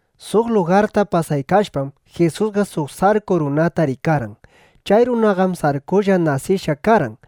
Suq lugarta pasaykashpam, Jisusqa suq sarku runata rikarqan. Chay runaqam sarkulla nasishqa karqan.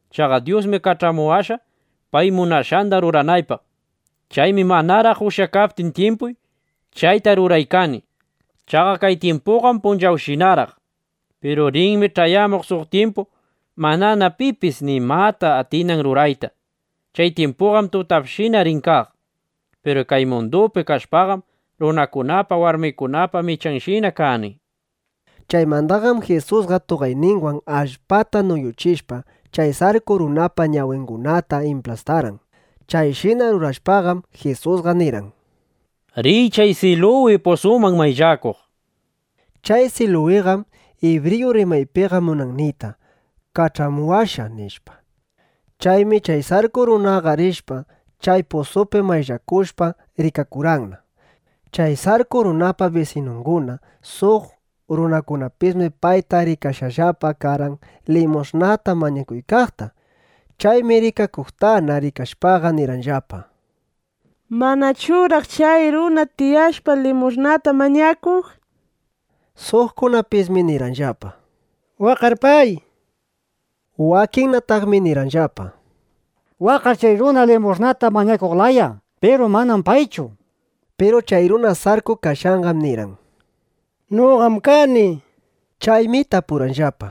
Chaqa Dyusmi kach'amuwashqa, pay munashqanda ruranaypaq. Chaymi manaraq ushyakaptin tyimpuy, chayta ruraykani. Chaqa kay tyimpuqam punchawshinaraq. Piru rinmi ch'ayamuq suq tyimpu, manana pipis nimata atinan rurayta. Chay tyimpuqam tutapshina rin kaq. Piru kay mundupi kashpaqam, runakunapa, warmikunapa michanshina kani, nishpa. Chaymandaqam Jisusqa tuqayninwan allpata nuyuchishpa, chay sarku runapa ñawingunata implastarqan. Chayshina rurashpaqam, Jisusqa nirqan: —Riy chay Siluwi pusuman mayllakuq, nishpa. Chay Siluwiqam ibriyu rimaypiqa munan niyta: “Kach'amushqa”, nishpa. Chaymi chay sarku runaqa rishpa, chay pusupi mayllakushpa, rikakurqanna. Chay sarku runapa bisinunguna, suq runakunapismi payta rikashqallapa karqan limush'nata mañakuykaqta. Chaymi rikakuqtana rikashpaqa, nirqanllapa: —¿Manachuraq chay runa tiyashpa limush'nata mañakuq? nishpa. Suqkunapismi nirqanllapa: —Waqqar pay, nishpa. Wakinnataqmi nirqanllapa: —Waqqar chay runa limush'nata mañakuq laya. Piru manam paychu, nishpa. Piru chay runa sarku kashqanqam nirqan: —Noqam kani, nishpa. Chaymi tapurqanllapa: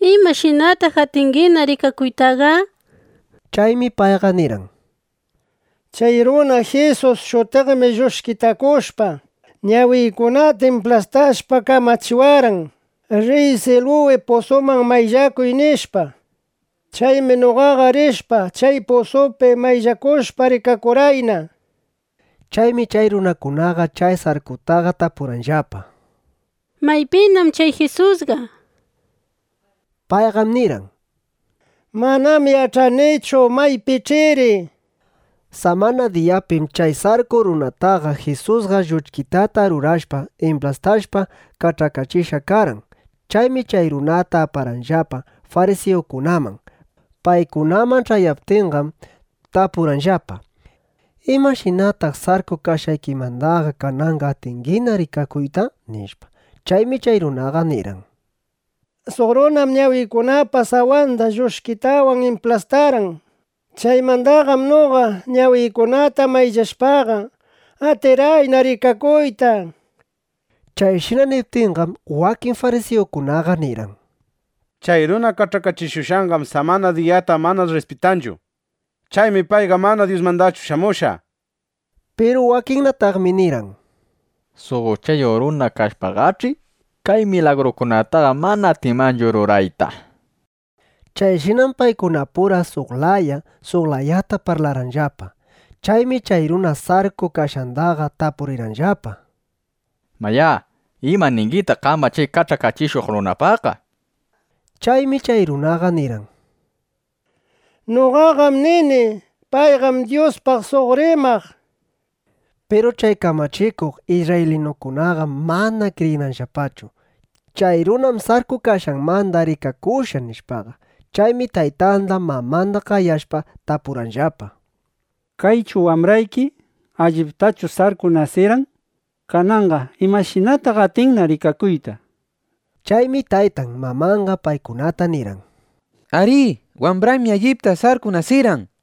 —¿Imashinataq atingina rikakuytaqa? nishpa. Chaymi payqa nirqan: —Chay runa Jisus shutiqmi lluchkitakushpa, ñawiykunata implastashpa, kamachiwarqan: “Riy Siluwi pusuman mayllakuq”, nishpa. Chaymi noqaqa rishpa, chay pusupi mayllakushpa, rikakurqayna, nishpa. Chaymi chay runakunaqa chay sarkutaqa tapurqanllapa: —¿Maypinam chay Jisusqa? nishpa. Payqam nirqan: —Manam yach'anichu. Maypinach'iri, nishpa. Samana diyapim chay sarku runataqa Jisusqa lluchkitata rurashpa, implastashpa kach'akachishqa karqan. Chaymi chay runata aparqanllapa farisiyukunaman. Paykunaman ch'ayaptinqam, tapurqanllapa: —¿Imashinataq sarku kashqaykimandaqa kananqa atingina rikakuyta? nishpa. Chaymi chay runaqa nirqan: —Suq runam ñawiykunapa sawanda lluchkitawan implastarqan. Chaymandaqam noqa ñawiykunata mayllashpaqa, atirqayna rikakuyta, nishpa. Chayshina niptinqam, wakin farisiyukunaqa nirqan: —Chay runa kach'akachishuqqam samana diyata mana rrispitanchu. Chaymi payqa mana Dyusmandachu shamushqa, nishpa. Piru wakinnataqmi nirqan: —Suq uchayuq runa kashpaqach'i, kay milagrukunataqa mana atinmanchu rurayta, nishpa. Chayshinam paykunapura suq laya, suq layata parlarqanllapa. Chaymi chay runa sarku kashqandaqa tapurirqanllapa: —¿Mayá, ima ningitaq qamqa chay kach'akachishuq runapaqqa? nishpa. Chaymi chay runaqa nirqan: —Noqaqam nini: Payqam Dyuspaq suq rimaq, nishpa. Piru chay kamachikuq isrraylinukunaqam mana kriyirqanllapachu: Chay runam sarku kashqanmanda rikakushqa, nishpaqa. Chaymi taytanda mamanda qayashpa, tapurqanllapa: —¿Kaychu wambrayki? ¿Alliptachu sarku nasirqan? Kananqa ¿imashinataq atinna rikakuyta? nishpa. Chaymi taytan mamanqa paykunata nirqan: —Arí, wambraymi. Alliptam sarku nasirqan.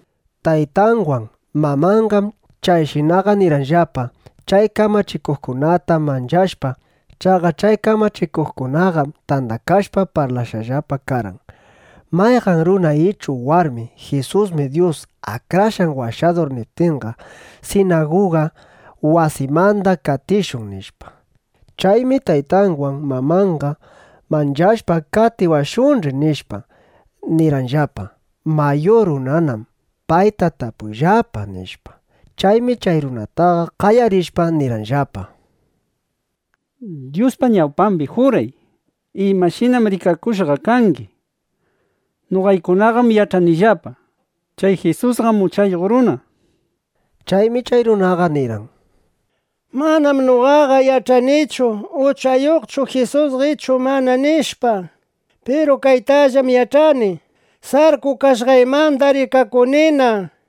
Taytanwan mamanqam chayshinaqa nirqanllapa, chay kamachikuqkunata manchashpa. Chaqa chay kamachikuqkunaqam tandakashpa parlashqallapa karqan: “Mayqan runa ichu warmi: ‘Jisusmi Dyus Akrashqan Washadur’ niptinqa, sinaguga wasimanda qatishun”, nishpa. Chaymi taytanwan mamanqa manchashpa: Qatiwashunch'i, nishpa, nirqanllapa: “Mayur runanam. Payta tapuyllapa”, nishpa. Chaymi chay runataqa qayarishpa, nirqanllapa: —Dyuspa ñawpambi juray: ¿Imashinam rikakushqa kangi? nishpa. Noqaykunaqam yach'anillapa: Chay Jisusqam uchayuq runa, nishpa. Chaymi chay runaqa nirqan: —Manam noqaqa yach'anichu: Uchayuqchu Jisusqa ichu mana, nishpa. Piru kaytallam yach'ani: Sarku kashqaymandam rikakunina, nishpa.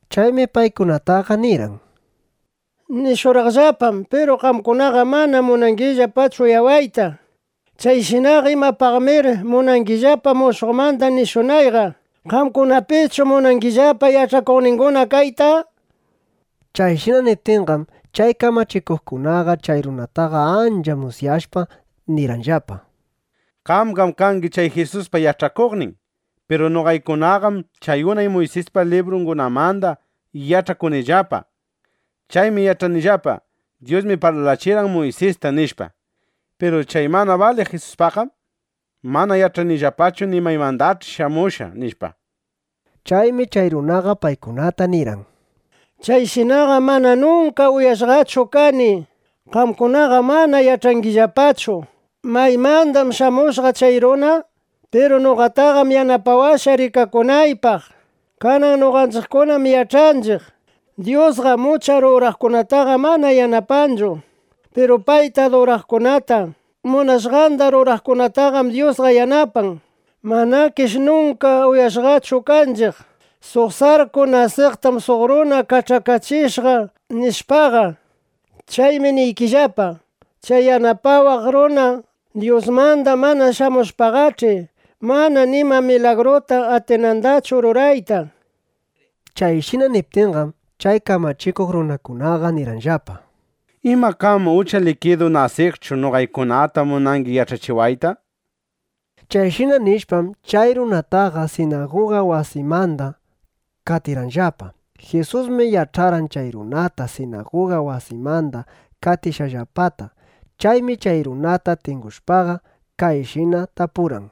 Chaymi paykunataqa nirqan: —Nishurqaqllapanam, piru qamkunaqam mana munangillapachu uyawayta. Chayshinaqa ¿imapaqnamir munangillapa mushuqmanda nirishunayqa? ¿Qamkunapischu munangillapa yach'akuqninguna kayta? nishpa. Chayshina niptinqam, chay kamachikuqkunaqa chay runataqa ancha musyashpa nirqanllapa: —Qamqam kangi chay Jisuspa yach'akuqnin. Piru noqaykunaqam chay unay Muysispa librungunamanda yach'akunillapa. Chaymi yach'anillapa: Dyusmi parlachirqan Muysista, nishpa. Piru chay mana baliq Jisuspaqqam mana yach'anillapachu ni maymandach'i shamushqa, nishpa. Chaymi chay runaqa paykunata nirqan: —¡Chayshinaqam mana nunka uyashqachu kani! Qamkunaqam mana yach'angillapachu: ¿Maymandam shamushqa chay runa? nishpa. Piru noqataqam yanapawashqa rikakunaypaq. Kanan noqanchiqkunam yach'anchiq: Dyusqam ucha ruraqkunataqa mana yanapanchu. Piru payta aduraqkunata, munashqanda ruraqkunataqam Dyusqa yanapan. Manakish nunka uyashqachu kanchiq: Suq sarku nasiqtam suq runa kach'akachishqa, nishpaqa. Chaymi niykillapa, chay yanapawaq runa, Dyusmanda mana shamushpaqach'i, mana nima milagruta atinandachu rurayta, nishpa. Chayshina niptinqam, chay kamachikuq runakunaqa nirqanllapa: —¿Ima qam ucha likidu nasiqchu noqaykunata munangi yach'achiwayta? nishpa. Chayshina nishpam, chay runataqa sinaguga wasimanda qatirqanllapa. Jisusmi yach'arqan chay runata sinaguga wasimanda qatishqanllapata. Chaymi chay runata tingushpaqa, kayshina tapurqan: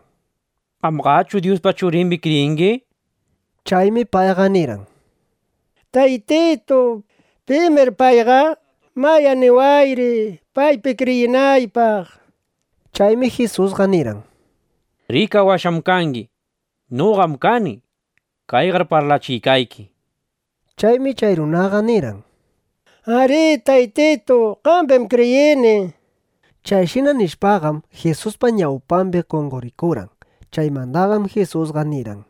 —¿Qamqachu Dyuspa Churimbi kriyingi? nishpa. Chaymi payqa nirqan: —Taytitu, ¿pimir payqa? Mayá niwayri, paypi kriyinaypaq, nishpa. Chaymi Jisusqa nirqan: —Rikawashqam kangi. Noqam kani. Kayqar parlachiykayki, nishpa. Chaymi chay runaqa nirqan: —Arí, Taytitu. Qambim kriyini, nishpa. Chayshina nishpaqam, Jisuspa ñawpambi qonqorikurqan. Chaymandaqam Jisusqa nirqan: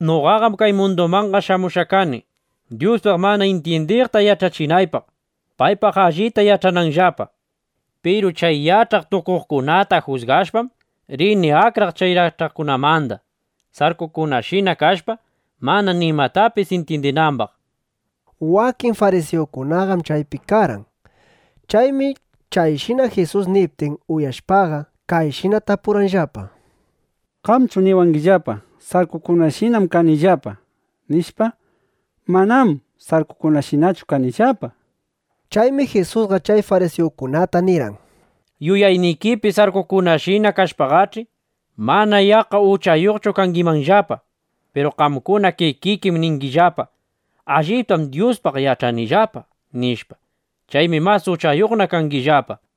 —Noqaqam kay mundumanqa shamushqa kani, Dyuspaq mana intyindiqta yach'achinaypaq, paypaq allita yach'ananllapa. Piru chay yach'aq tukuqkunata jusgashpam, rini akraq chay yach'aqkunamanda, sarkukunashina kashpa, mana nimatapis intyindinambaq, nishpa. Wakin farisiyukunaqam chaypi karqan. Chaymi chayshina Jisus niptin uyashpaqa, kayshina tapurqanllapa: —¿Qamchu niwangillapa: “Sarkukunashinam kangillapa”, nishpa? Manam sarkukunashinachu kanillapaqa, nishpa. Chaymi Jisusqa chay farisiyukunata nirqan: —Yuyaynikipi sarkukunashina kashpaqach'i, mana yaqqa uchayuqchu kangimanllapa. Piru qamkuna kikikim ningillapa: “Allitam Dyuspaq yach'anillapa”, nishpa. Chaymi mas uchayuqna kangillapa.